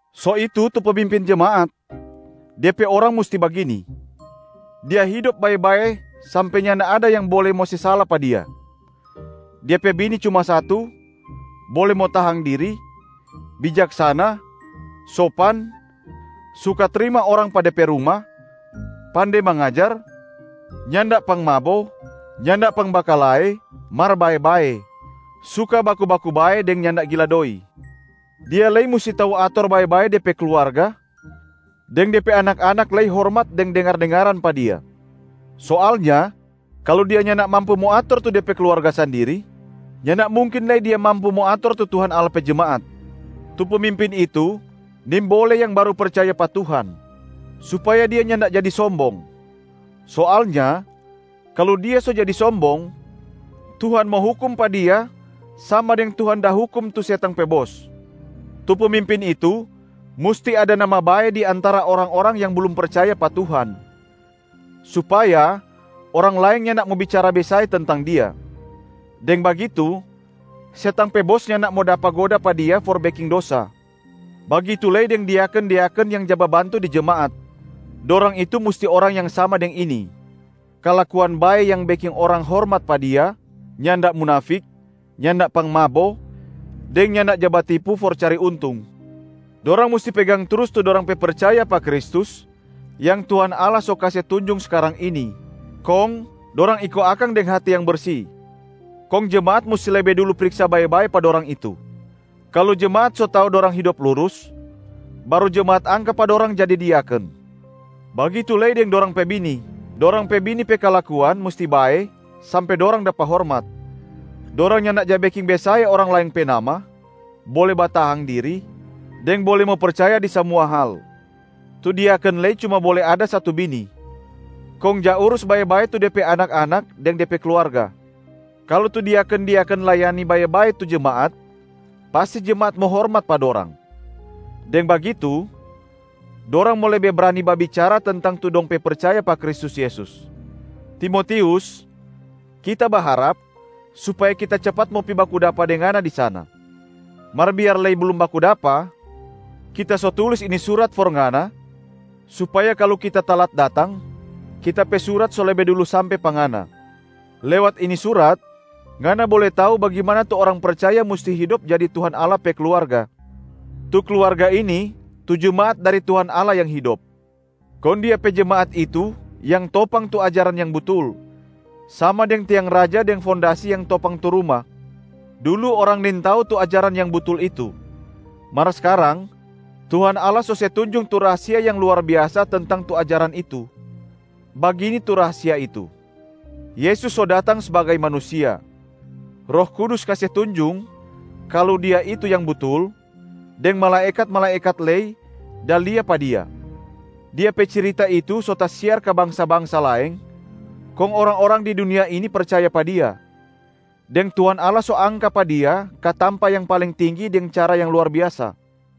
So itu tu pemimpin jemaat, de pe orang musti bagini: dia hidop bae-bae sampe nyanda ada yang bole mo se sala pa dia, dia pe bini cuma satu, bole mo tahang diri, bijaksana, sopan, suka trima orang pa de pe ruma, pande mangajar, nyanda pangmabo, nyanda pangbakalae mar bae-bae, suka baku-baku bae deng nyanda gila doi. Dia lei musti tau ator bae-bae de pe kluarga, deng de pe anak-anak lei hormat deng dengar-dengaran pa dia. Soalnya kalu dia nyanda mampu mo ator tu de pe kluarga sandiri, nyanda mungkin lei dia mampu mo ator tu Tuhan Allah pe jemaat. Tu pemimpin itu nimbole yang baru percaya pa Tuhan, supaya dia nyanda jadi sombong. Soalnya kalu dia so jadi sombong, Tuhan mo hukum pa dia sama deng Tuhan da hukum tu setang pe bos. Tu pemimpin itu musti ada nama bae di antara orang-orang yang blum percaya pa Tuhan, supaya orang laeng nyanda mo bicara besae tentang dia. Deng bagitu setang pe bos nyanda mo dapa goda pa dia for beking dosa. Bagitu lei deng diaken-diaken yang ja babantu di jemaat, dorang itu musti orang yang sama deng ini: kalakuan bae yang beking orang hormat pa dia, nyanda munafik, nyanda pangmabo deng nyanda ja batipu for cari untung. Dorang musti pegang trus tu dorang pe percaya pa Kristus yang Tuhan Allah so kase tunjung skarang ini, kong dorang iko akang deng hati yang bersi. Kong jemaat musti lebe dulu priksa bae-bae pa dorang itu. Kalu jemaat so tau dorang hidop lurus, baru jemaat angka pa dorang jadi diaken. Bagitu lei deng dorang pe bini, dorang pe bini pe kalakuan musti bae sampe dorang dapa hormat, dorang nyanda ja beking besae orang laeng pe nama, bole batahang diri, deng bole mo percaya di samua hal. Tu diaken lei cuma bole ada satu bini, kong ja urus bae-bae tu de pe anak-anak deng de pe kluarga. Kalu tu diaken-diaken layani bae-bae tu jemaat, pasti jemaat mo hormat pa dorang. Deng bagitu dorang mo lebe brani babicara tentang tu dong pe percaya pa Kristus Yesus. Timotius, kita baharap supaya kita capat mo pi baku dapa deng ngana di sana. Mar biar lei blum baku dapa, kita so tulis ini surat for ngana, supaya kalu kita talat datang, kita pe surat so lebe dulu sampe pa ngana. Lewat ini surat, ngana bole tau bagimana tu orang percaya musti hidop jadi Tuhan Allah pe kluarga. Tu kluarga ini tu jemaat dari Tuhan Allah yang hidop. Kong Dia pe jemaat itu yang topang tu ajaran yang butul, sama deng tiang raja deng fondasi yang topang tu ruma. Dulu orang nintau tu ajaran yang butul itu, mar skarang Tuhan Allah so se tunjung tu rahasia yang luar biasa tentang tu ajaran itu. Bagini tu rahasia itu: Yesus so datang sbagai manusia. Roh Kudus kase tunjung kalu Dia itu yang butul, deng malaekat-malaekat lei da lia pa Dia. Dia pe cirita itu so tasiar ka bangsa-bangsa laeng, kong orang-orang di dunia ini percaya pa Dia, deng Tuhan Allah so angka pa Dia ka tampa yang paling tinggi deng cara yang luar biasa.